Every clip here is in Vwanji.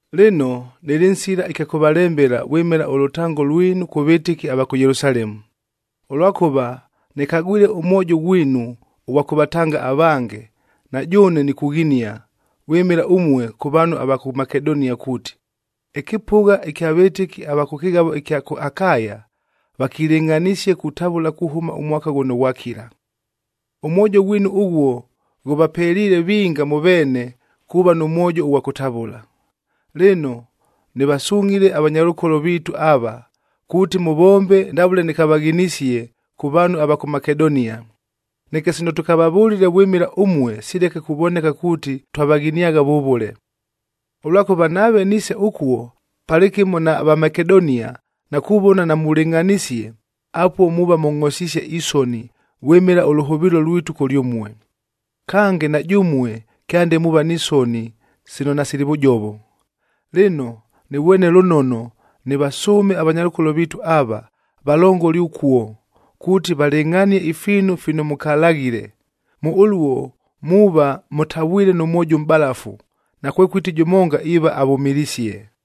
Lɨno, nɨlɨ nsila ɨkya kʉvalembela vwɨmɨla ʉlʉtango lwinu kʉ vɨtɨki ava kʉ Yelusalemu, ʉlwakʉva nɨkagwile ʉmwojo ghwinu ʉghwa kʉvatanga avange, na jʉʉne nikughinia vwɨmɨla ʉmue kʉ vaanhu ava kʉ Makedonia, kuuti, “Ɨkɨpʉgha ɨkya vɨtɨki ava kʉ kɨghavo ɨkya kʉ Akaya vakilɨngʼhanisie kutavʉla kuhʉma ʉmwaka ghʉno ghwakila.” Ʉmwojo ghwinu ʉghuo ghʉvapeliile vinga mʉ veene kuuva nʉ mwojo ʉghwa kʉtavʉla. Lɨno, nɨvasungʼhile avanyalʉkolo viitu ava, kuuti mʉvombe ndavʉle nɨkavaghinisie kʉ vaanhu ava kʉ Makedonia, neke sino tʉkavavʉlile vwɨmɨla ʉmue sileke kuvoneka kuuti twavaghiniagha vʉvʉle. Ʉlwakʉva nave niise ʉkuo palɨkɨmo na Vamakedonia na kuvona namulɨngʼhanisie, apuo muuva mʉngʼhosisie isoni vwɨmɨla ʉlʉhʉvɨɨlo lwitu kʉlyʉmue. Kange, na jʉmue kyande muuva ni soni sino nasili vʉjovo. Lɨno, nɨvwene lʉnono nɨvasʉʉme avanyalʉkolo viitu ava, valongole ʉkuo, kuuti valɨngʼhanie ifiinu fino mʉkalaghile. Mʉ ʉluo muuva mʉtavwile nʉ mwojo ʉmʼbalafu, nakwekʉti jʉmonga iiva avʉmɨlisie.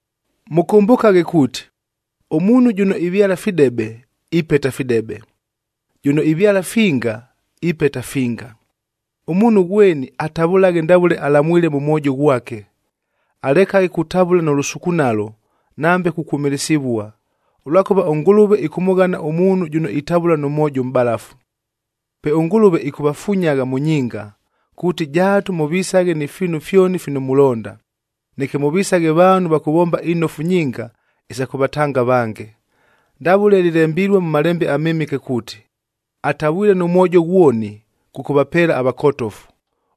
Mʉkʉmbʉkaghe kuuti, “Ʉmuunhu jʉno ivyala fidebe, ipeta fidebe; jʉno ivyala finga, ipeta finga.” Ʉmuunhu ghweni atavʉlaghe ndavʉle alamwile mʉ mwojo ghwake, alekaghe kutavʉla nʉ lʉsukunalo nambe kukwʉmɨlɨsɨvua, ʉlwakʉva ʉNgʉlʉve ɨkʉmʉghana ʉmuunhu jʉno itavʉla nʉ mwojo ʉmʼbalafu. Pe ʉNgʉlʉve ɨkʉvafunyagha mʉ nyinga, kuuti jaatu mʉvisaghe ni fiinu fyoni fino mulonda, neke mʉvisaghe vaanhu va kʉvomba inofu nyinga isa kʉvatanga avange. Ndavʉle lɨlembilue mʉ Malembe aMɨmɨke kuuti, “Atavwile nʉ mwojo ghwoni, kʉkʉvapeela avakotofu.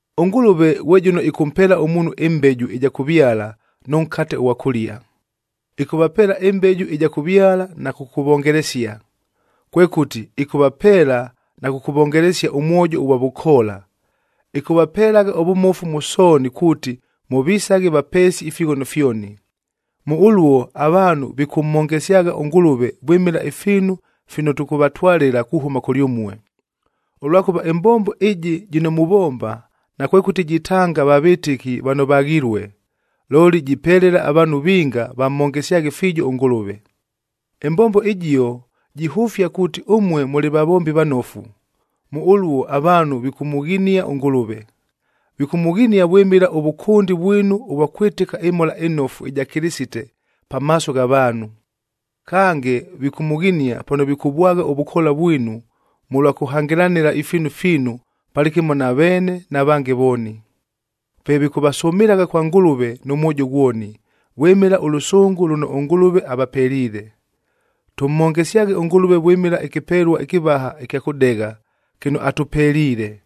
ɄNgʉlʉve ghwe jʉno ɨkʉmpeela ʉmuunhu ɨmbeju ɨja kʉvyala nʉ nkate ʉghwa kʉlia, ɨkʉvapeela ɨmbeju ɨja kʉvyala na kʉkʉvongelesia. Kwekʉti, ɨkʉvapeela na kʉkʉvongelesia ʉmwojo ʉghwa vʉkoola. Ɨkʉvapelagha ʉvʉmofu mʉ sooni kuuti, mʉvisaghe vapeesi ifighono fyoni. Mʉ ʉluo avaanhu vikʉmhongesyagha ʉNgʉlʉve vwɨmɨla ifiinu fino tʉkʉvatwalɨla kuhʉma kʉlyʉmue. Ʉlwakʉva ɨmbombo ɨjɨ jɨno muvomba, nakwekʉti jitanga va vɨtɨki vano vaghilue, looli jipelela avaanhu vinga vamhongesyaghe fiijo ʉNgʉlʉve. Ɨmbombo ɨjio jihʉfia kuuti ʉmue mʉlɨ vavombi vanofu, mʉ ʉluo avaanhu vikʉmʉghinia ʉNgʉlʉve. Vikʉmʉghinia vwɨmɨla ʉvʉkʉndi vwinu ʉvwa kwɨtɨka ɨMhola ɨNofu ɨja Kɨlɨsite pamaaso gha vaanhu. Kange, vikʉmʉghinia pano vikʉvwagha ʉvʉkoola vwinu mʉlwa kʉhangɨlanɨla ifiinu fiinu palɨkɨmo na veene na vange vooni. Pe vikʉvasʉmɨlagha kwa Ngʉlʉve nʉ mwojo ghwoni, vwɨmɨla ʉlʉsʉngʉ lʉno ʉNgʉlʉve avapeliile. Tʉmhongesyaghe ʉNgʉlʉve vwɨmɨla ɨkɨpelua ɨkɨvaha ɨkya kʉdegha, kɨno atʉpeliile.